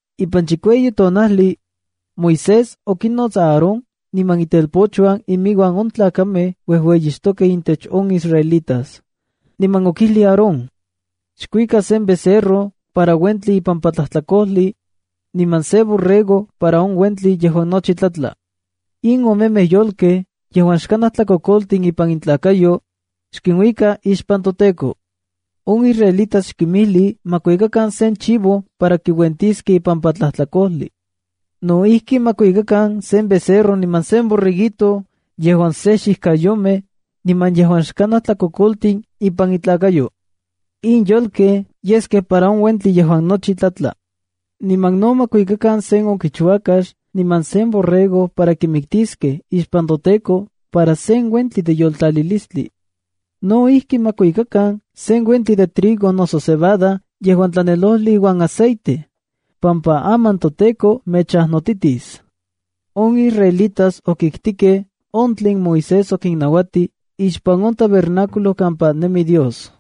Ipan chikueyi tonajli, Moisés okinots Aarón niman itelpochuan inmiuan on tlakamej uejueyixtokej intech on israelitas. Niman okijlij Aarón: “Xkuika sen becerro para uentli ipampa tlajtlakojli, niman sen borrego para on uentli yejuan nochi tlatla. In omemej yolkej yejuan xkanaj tlakokoltin ipan intlakayo, xkinuika ixpan toTEKO. On israelitas xkinmijli ma kuikakan sen chivo para kiuentiskej ipampa tlajtlakojli. No ijki, ma kuikakan sen becerro niman sen borreguito yejuan se xijkayomej, niman yejuan xkanaj tlakokoltin impan intlakayo. In yolkej yeskej para on uentli yejuan nochi tlatla. Niman no ma kuikakan sen okichuakax niman sen borrego para kinmiktiskej ixpan toTEKO para sen uentli de yoltlalilistli. No ijki, ma kuajkikan sen uentli de trigo noso cebada yejuan tlanelojli iuan aceite, pampa aman toTEKO mechajnotitis.” On israelitas okiktikej on tlen Moisés okinnauatij ixpan on tabernáculo kampa nemi Dios.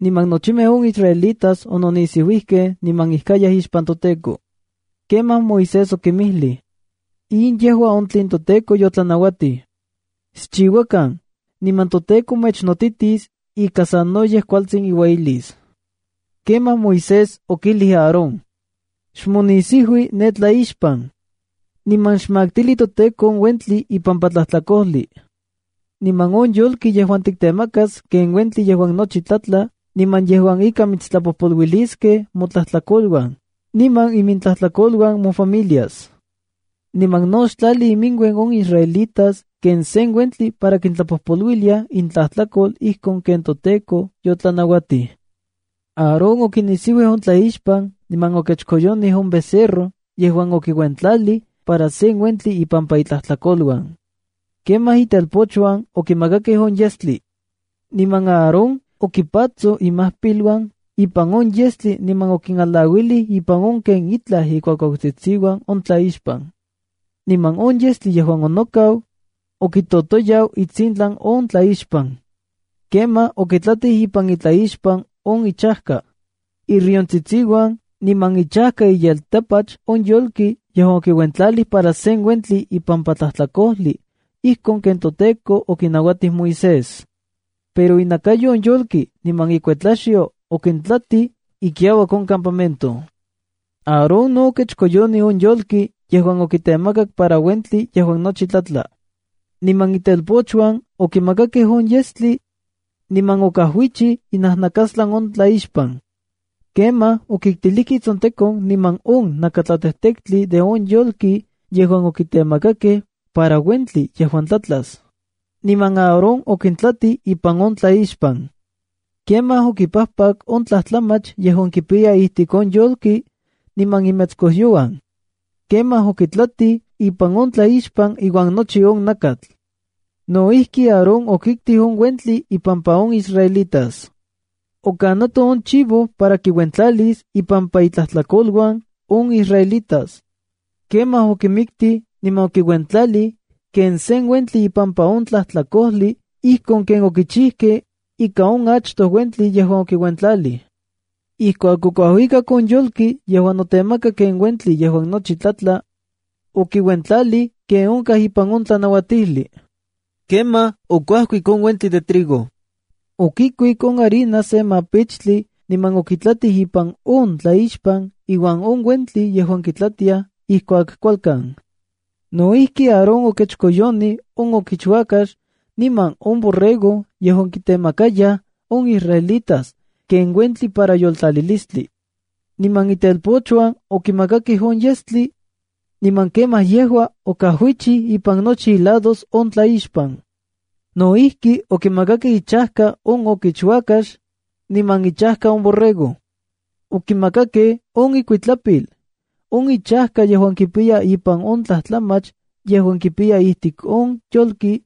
Niman nochimej on israelitas ononisiuijkej niman ijkayaj ixpan toTEKO. Kemaj Moisés okinmijlij: “In yejua on tlen toTEKO yotlanauatij. Xchiuakan, niman toTEKO mechnotitis ika sanoyej kualtsin iueyilis”. Kemaj Moisés okijli Aarón: “Xmonisiui ne tlaixpan, niman xmaktili toTEKO on uentli ipampa tlajtlakojli, niman on yolki yejuan tiktemakas ken uentli yejuan nochi tlatla niman yejuan ika mitstlapojpoluiliskej motlajtlakoluan niman imintlajtlakoluan mofamiliasa. Niman no xtlali iminuen on israelitas ken sen uentli para kintlapojpoluilia intlajtlakol ijkon ken toTEKO otlanauatij.” Aarón okinisiuij on tlaixpan niman okechkoyonij on becerro yejuan okiuentlalij para sen uentli ipampa itlajtlakoluan. Kemaj itelpochuan okimakakej on yestli. Niman Aarón okipatsoj imajpiluan ipan on yestli niman okinmalauilij ipan on ken itlaj ikuakuautsitsiuan on tlaixpan. Niman on yestli yejuan onokau, okitotoyau itsintlan on tlaixpan. Kemaj okitlatij ipan on tlaixpan on ichajka, iriontsitsiuan, niman ichajka iyeltapach on yolki yejuan okiuentlalij para sen uentli ipampa tlajtlakojli ijkon ken toTEKO okinauatij Moisés. Pero inakayo on yolki niman ikuetlaxyo okintlatij ikiauak on campamento. Aarón no okechkoyonij on yolki yejuan okitemakak para uentli yejuan nochi tlatla. Niman itelpochuan okimakakej on yestli, niman okajuichij inajnakastlan on tlaixpan. Kemaj okiktilijkej itsontekon niman on nakatlatejtektli de on yolki yejuan okitemakakej para uentli yejuan tlatlas, niman Aarón okintlatij ipan on tlaixpan. Kemaj okipajpak on tlajtlamach yejuan kipiya ijtik on yolki, niman imetskojyouan. Kemaj okintlatij ipan on tlaixpan iuan nochi on nakatl. No ijki, Aarón okiktik on uentli impampa on israelitas. Okanato on chivo para kiuentlalis ipampa intlajtlakoluan on israelitas. Kemaj okimiktij niman okiuentlalij ken sen uentli ipampa on tlajtlakojli ijkon ken okichijkej ika on achtoj uentli yejuan okiuentlalij. Ijkuak okuajuikak on yolki yejuan notemaka ken uentli yejuan nochi tlatla, okiuentlalij ken onkaj ipan on tlanauatijli. Kemaj okuajkik on uentli de trigo. Okikuik on harina se mapichtli niman okitlatij ipan on tlaixpan iuan on uentli yejuan kitlatiaj ijkuak kualkan. No ijki, Aarón okechkoyonij on okichuakax niman on borrego yejuan kitemakayaj on israelitas ken uentli para yoltlalilistli. Niman itelpochuan okimakakej on yestli, niman kemaj yejua okajuichi ipan nochi ilados on tlaixpan. No ijki, okimakakej ichajka on okichuakax, niman ichajka on borrego. Okimakakej on ikuitlapil, on ichajka yejuan kipiya ipan on tlajtlamach yejuan kipiya ijtik on yolki,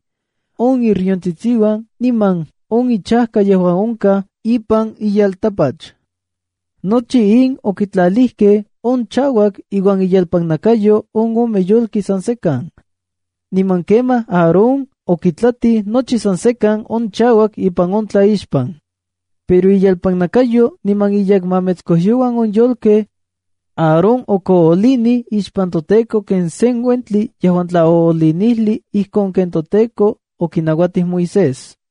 on iriontsitsiuan niman on ichajka yejuan onkaj ipan iyeltapach. Nochi in okitlalijkej on chauak iuan inyelpannakayo on ome yolki san sekan. Niman kemaj Aarón okitlatij nochi san sekan on chauak ipan on tlaixpan. Pero inyelpannakayo niman inyekmametskojyouan on yolkej, Aarón okoolinij ixpan toTEKO ken sen uentli yejuan tlaoolinijli ijkon ken toTEKO okinauatij Moisés.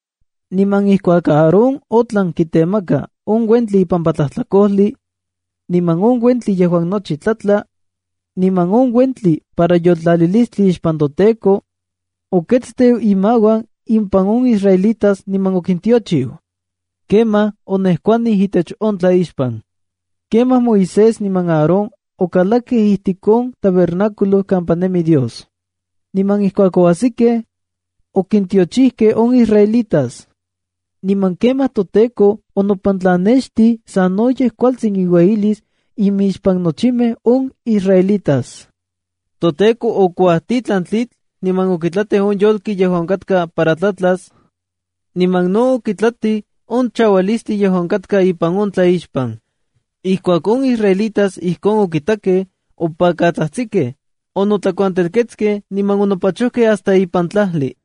Niman ijkuak Aarón otlan kitemaka on uentli ipampa tlajtlakojli, niman on uentli yejuan nochi tlatla, niman on uentli para yoltlalilistli ixpan toTEKO, oketsteu imauan impan on israelitas niman okintiochiu. Kemaj onejkuanij itech on tlaixpan. Kemaj Moisés niman Aarón okalakej ijtik on tabernáculo kampa nemi Dios. Niman ijkuak ouajkiskej, okintiochijkej on israelitas. Niman kemaj toTEKO onopantlannextij sanoyej kualtsin iueyilis imixpan nochimej on israelitas. ToTEKO okuajtitlan tlitl niman okitlatij on yolki yejuan onkatka para tlatlas, niman no okitlatij on chaualistli yejuan onkatka ipan on tlaixpan. Ijkuak on israelitas ijkon okitakej, opakatsajtsikej, onotlakuantelketskej niman onopachojkej hasta ipan tlajli.